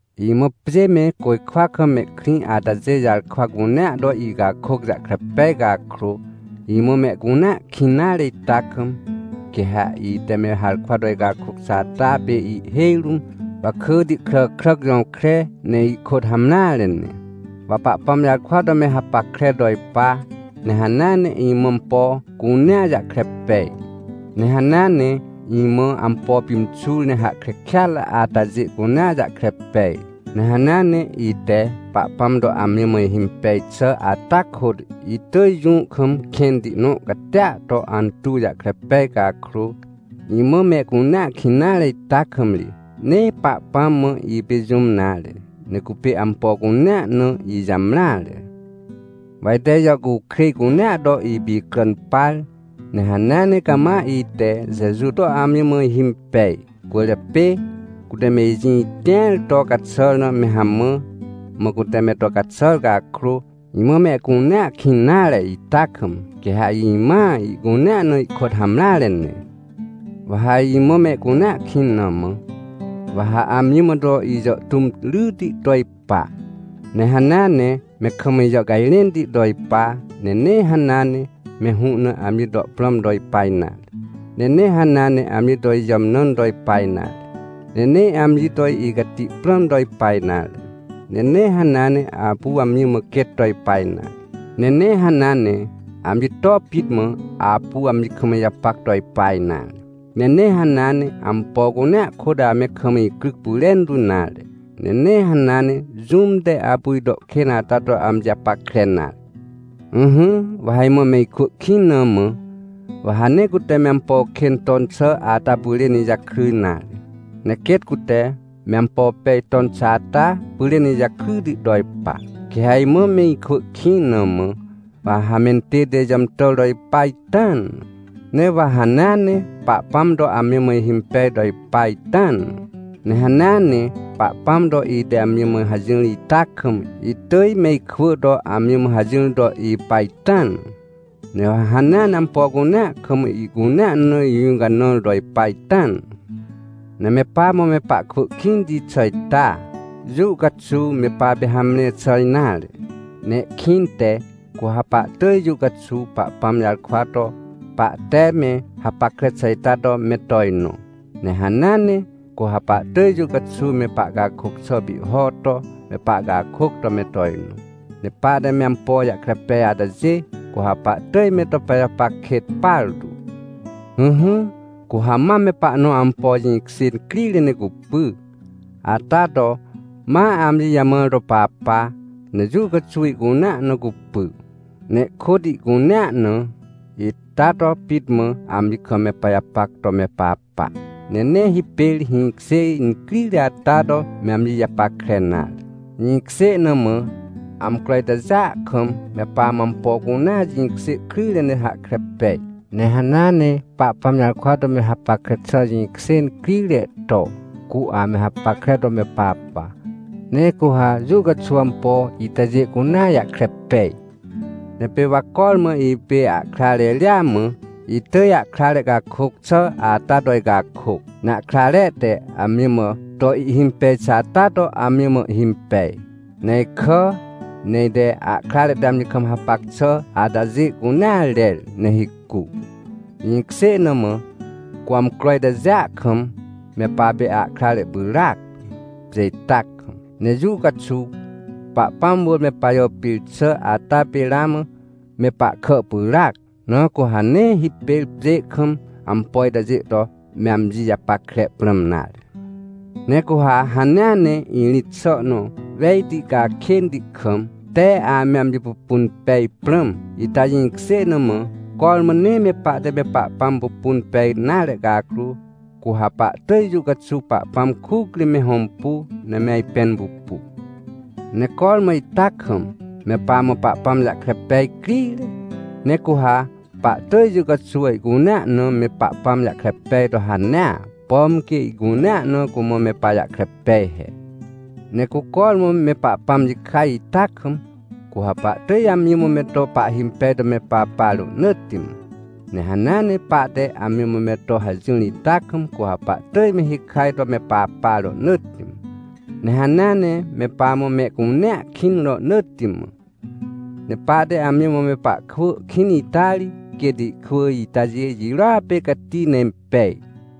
Imã pjê me côjkwa kam mehkrĩ atajê jarkwa cunea to icakôc jahkre pej cakrô, imã mehcunea kĩn nare ita kam, quê ha ite me harkwa to icakôc xà ata pê ihhêj rũm wakỳti kràkràc jõkre, ne ihkôt hamreare ne. Wa Pahpãm jarkwa to me hapackre to ipa, ne hanea ne imã ampo cunea jahkre pej, ne hanea ne imã ampo pimxur, ne hahkre kêatre atajê cunea jahkre pej, ne hanea ne ite Pahpãm to amji mã ihimpej xà ata kôt itỳj jũ kam kẽnti nõ catia to antuw jahkre pej cakrô, imã mehcunea kĩn nare ita kam ri, nee Pahpãm mã ipê jũm nare, ne cupê ampo cunea na ijamreare. Wa ite ijàhcukrêj cunea to ipicràn par, ne hanea ne cama ite, Jeju to amji mã ihimpej cwỳrjapê, cute me ijĩ tĩar to caxàr na me hamã, mã cute me to caxàr cakrô, imã mehcunea kĩn nare ita kam, quê ha imãa ihcunea na ihkôt hamreare ne. Wa ha imã mehcunea kĩn na mã, wa ha amji mã me to ijàhtũm ryti to ipa. Ne hanea ne me kam ijàhcajrẽnti to ipa, ne nee hanea ne me hũ na amji to prãm to ipa nare. Ne nee hanea ne amji to ijàmnãn to ipa nare. Ne nee amji to icati prãm to ipa nare. Ne nee hanea ne apu amji mã quêt to ipa nare. Ne nee hanea ne, amji to pit mã apu amji kam ijapac to ipa nare. Ne nee hanea ne ampo cunea kôt ame kam icryc pyrentu nare. Ne nee hanea ne jũm te apu ito kên ata to amji japackre nare. Ỹhỹ, wa ha imã me ikwỳ kĩn na mã, wa ha nee cute me ampo kên ton xà ata pyrên ijakry nare. Ne quêt cute me ampo pej ton xà ata pyrên ijakryti to ipa. Quê ha imã me ikwỳ kĩn na mã, wa ha mentête ijàmtàr to ipa ita na. Ne wa hanea ne Pahpãm to amji mã ihimpej to ipa ita na. Ne hanea ne Pahpãm to ite amji mã hajỹr ita kam, itỳj me ikwỳ to amji mã hajỹr to ipa ita na. Ne wa hanea ne ampo cunea kam, ihcunea na ijũcanãr to ipa ita na. Ne me pamã me pahkwỳ kĩnti xà ita, jũ caxuw me papê hamre xà nare. Ne ihkĩnte, cu ha pahtỳj jũ caxuw Pahpãm jarkwa to pahte me hapackre xà ita to me tojnõ. Ne hanea ne, cu ha pahtỳj jũ caxuw me pahcakôc xà pihho to me pahcakôc to me tojnõ. Ne pahte me ampo jahkre pej atajê, cu ha pahtỳj me to pajapac kêt partu. Ỹhỹ, cu ha mam me pahnõ ampo jĩkjê crire ne cupy, ata to ma amji jamãr to papa, ne jũ caxuw ihcunea na cupy, ne ihkôt ihcunea na ita to pit mã amji kam me pajapac to me papa, ne nee hipêr hĩkjê incrire ata to me amji japackre nare. Jĩkjê na mã, amcro itajêa kam me pamã ampo cunea jĩkjê kryjre ne hahkre pej. Ne hanea ne Pahpãm jarkwa to me hapackre xà jĩkjê incrire to, cu ame hapackre to me papa. Ne cu ha jũ caxuw ampo itajê cunea jahkre pej. Ne pê wa cormã ipê ahkrare ria mã, itỳj ahkrare cakôc xà ata to icakôc, ne ahkrare te amji mã to ihhimpej xà ata to amji mã ihimpej. Ne ikà, ne ite ahkrare te amji kam hapac xà atajê cunea rer, ne hicu. Jĩkjê na mã, cu amcro itajêa kam, me papê ahkrare pyràac, pjê ita kam. Ne jũ caxuw Pahpãm wỳr me pajàpir xà ata pê ramã me pahkà pyràac, na cu ha nee hipêr pjê kam ampo itajê to me amji japackre prãm nare. Ne cu ha hanea ne irĩt xà nõ wejti cakênti kam, te ame amji pupun pej prãm, ita jĩkjê na mã, cormã nee me pahte me Pahpãm pupun pej nare cakrô, cu ha pahtỳj jũ caxuw Pahpãm kuc ri me hõmpu, ne me ajpẽn pupu. Ne cormã ita kam, me pamã Pahpãm jahkre pej crire, ne cu ha pahtỳj jũ caxuw ihcunea na me Pahpãm jahkre pej to hanea, pom quê ihcunea na cumã me pajahkre pej he. Ne cu cormã me Pahpãm jikaj ita kam, cu ha pahtỳj amji mã me to pahhimpej to me papa rohnỳtti mã. Ne hanea ne pahte amji mã me to hajỹr ita kam, cu ha pahtỳj me hikaj to me papa rohnỳtti mã. Ne hanea ne me pamã mehcunea kĩn rohnỳtti mã. Ne pahte amji mã me pahkwỳ kĩn ita ri, quêt ihkwỳ itajê jirôa pê cati ne impej.